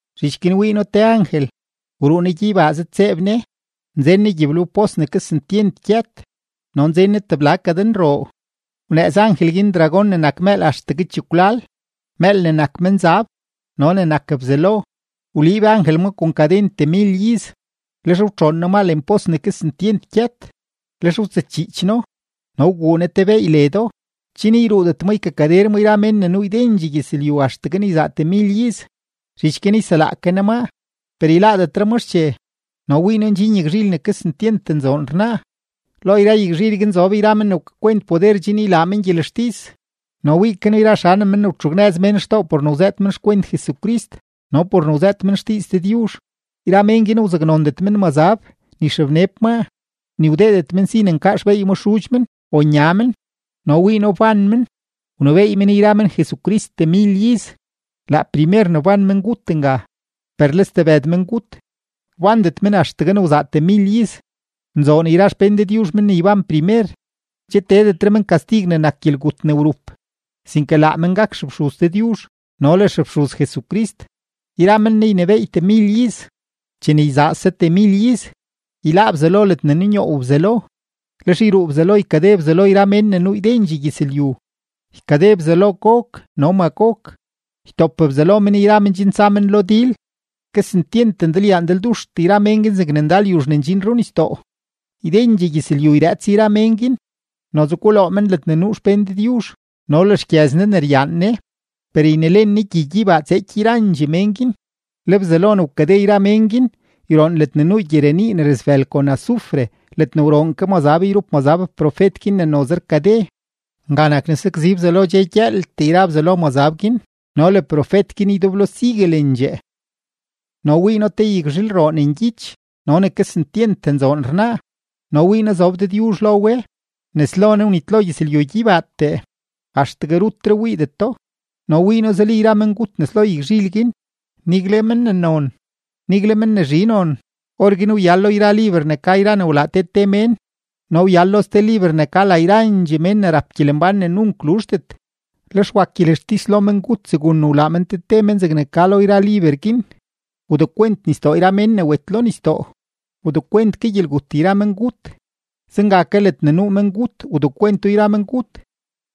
Zhich guin wii noo te angel, wruu ne gyeybaa zëdtseeb ne, nzen ne gyiblewpos ne kesentyent gyët no nzen ne tebla kadenroo. Wnëëz angel guin dragón ne nak mëël axtegue chekwlal, mëël ne nak menzab no ne nak Bzelo; wliib angel ma kon kaden temil iz. Lex wtxoon ne ma lenpos ne kesentyent gyët, lex wtsëchiich no, wguu ne te beey ledo, chen yruudet ma ykakader ma yra mén ne nuu ydendxee gyëzlyu axtegue ne yzaa temil iz. Zhich guin yselaa ke ne maa, per yláádetre ma xche. No wii noo ndxin yagzhil ne kesentyent nzoon rnaa, lo yra yagzhil guin zob yra mén ne wkakwent poder chen ylaa men gyelextis. No wii ke noo yra xanem men ne wtxugnëz mén xtoo por ne wzëët men xkwent Jesucrist no por ne wzëët men xdiiz Dëdyuzh; yra mén guin wzaknondet men mazab ni xebneb maa, ni wdeedet men si ne nkaa xbeey ma xudx men o nya men. No wii noo wban men, wnebééy men yra men Jesucrist temil iz. Laa primer ne wban mengut nga. Per le stebëd mengut, wbandet men axtegue ne wzaa temil iz. ¡Nzoon yra xpén Dëdyuzh men ne yban primer! Che teedetre men kastig ne nak gyelgut ne wrup, sinke laa men gak xefxuz Dëdyuzh no le xefxuz Jesucrist, yra men Ne ynebééy temil iz. Chene yzaase temil iz, yláá Bzelo ledne nunyoow Bzelo, lex yruu Bzelo ykade Bzelo yra mén ne nuu ydendxee gyëzlyu, ykade Bzelo Gog no Magog, ytop Bzelo men yra men chen tsa men lo dil. Kesentyent ndalyaa ndalduxtee yra mén guin zegne ndal yuzh ne ndxin runisdoo. Ydendxee gyëzlyu yrëëts yra mén guin, noze guloo men ledne nuu xpén Dëdyuzh no le xgyëz Ne ne ryaan Ne; per ynelen Ne gyi gyeybaa tseeky yrandxee mén guin. Le Bzelo ne wkade yra mén guin yroon ledne nuu gyirenii ne rasbël kon azufre ledne wroon ke mazab yrup ma profet guin ne noze rkade. Nga nak ne sakzi Bzelo dxe gyëëltee yra Bzelo mazab guin no le profet guin ydeblo siguelendxee. No wii noo te yagzhilroo ne ngyich no ne kesentyent nzoon rnaa no wii noo zob Dëdyuzh lo we. Nes lo Ne wnitlo gyëzlyu gyeybaatee, axtegue rutre wiidetro. No wii noo zuli yra mengut nes lo yagzhil guin, nigle men ne non, nigle men ne zhi non. Orguin wyal lo yra liber ne ka yra ne wlaa te te mén, no wyal lo ste liber ne ka la yrandxee mén ne rap gyelembán ne nunk luzhdet. Lex wak gyelextis lo mengut segun ne wlaa men te te men zegne ka lo yra liber guin. Wdekwent nisdoo yra mén ne wet lo nisdoo, wdekwent ke gyelgut yra mengut, zenga ke ledne nuu mengut wdekwento yra mengut;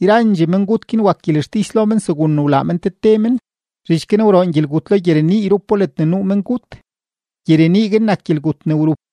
yrandxee mengut guin wak gyelextis lo men segun ne wlaa men te te men. Zhich guin wroon gyelgut lo gyirenii yrupo ledne nuu mengut. Gyirenii guin nak gyelgut ne wrup.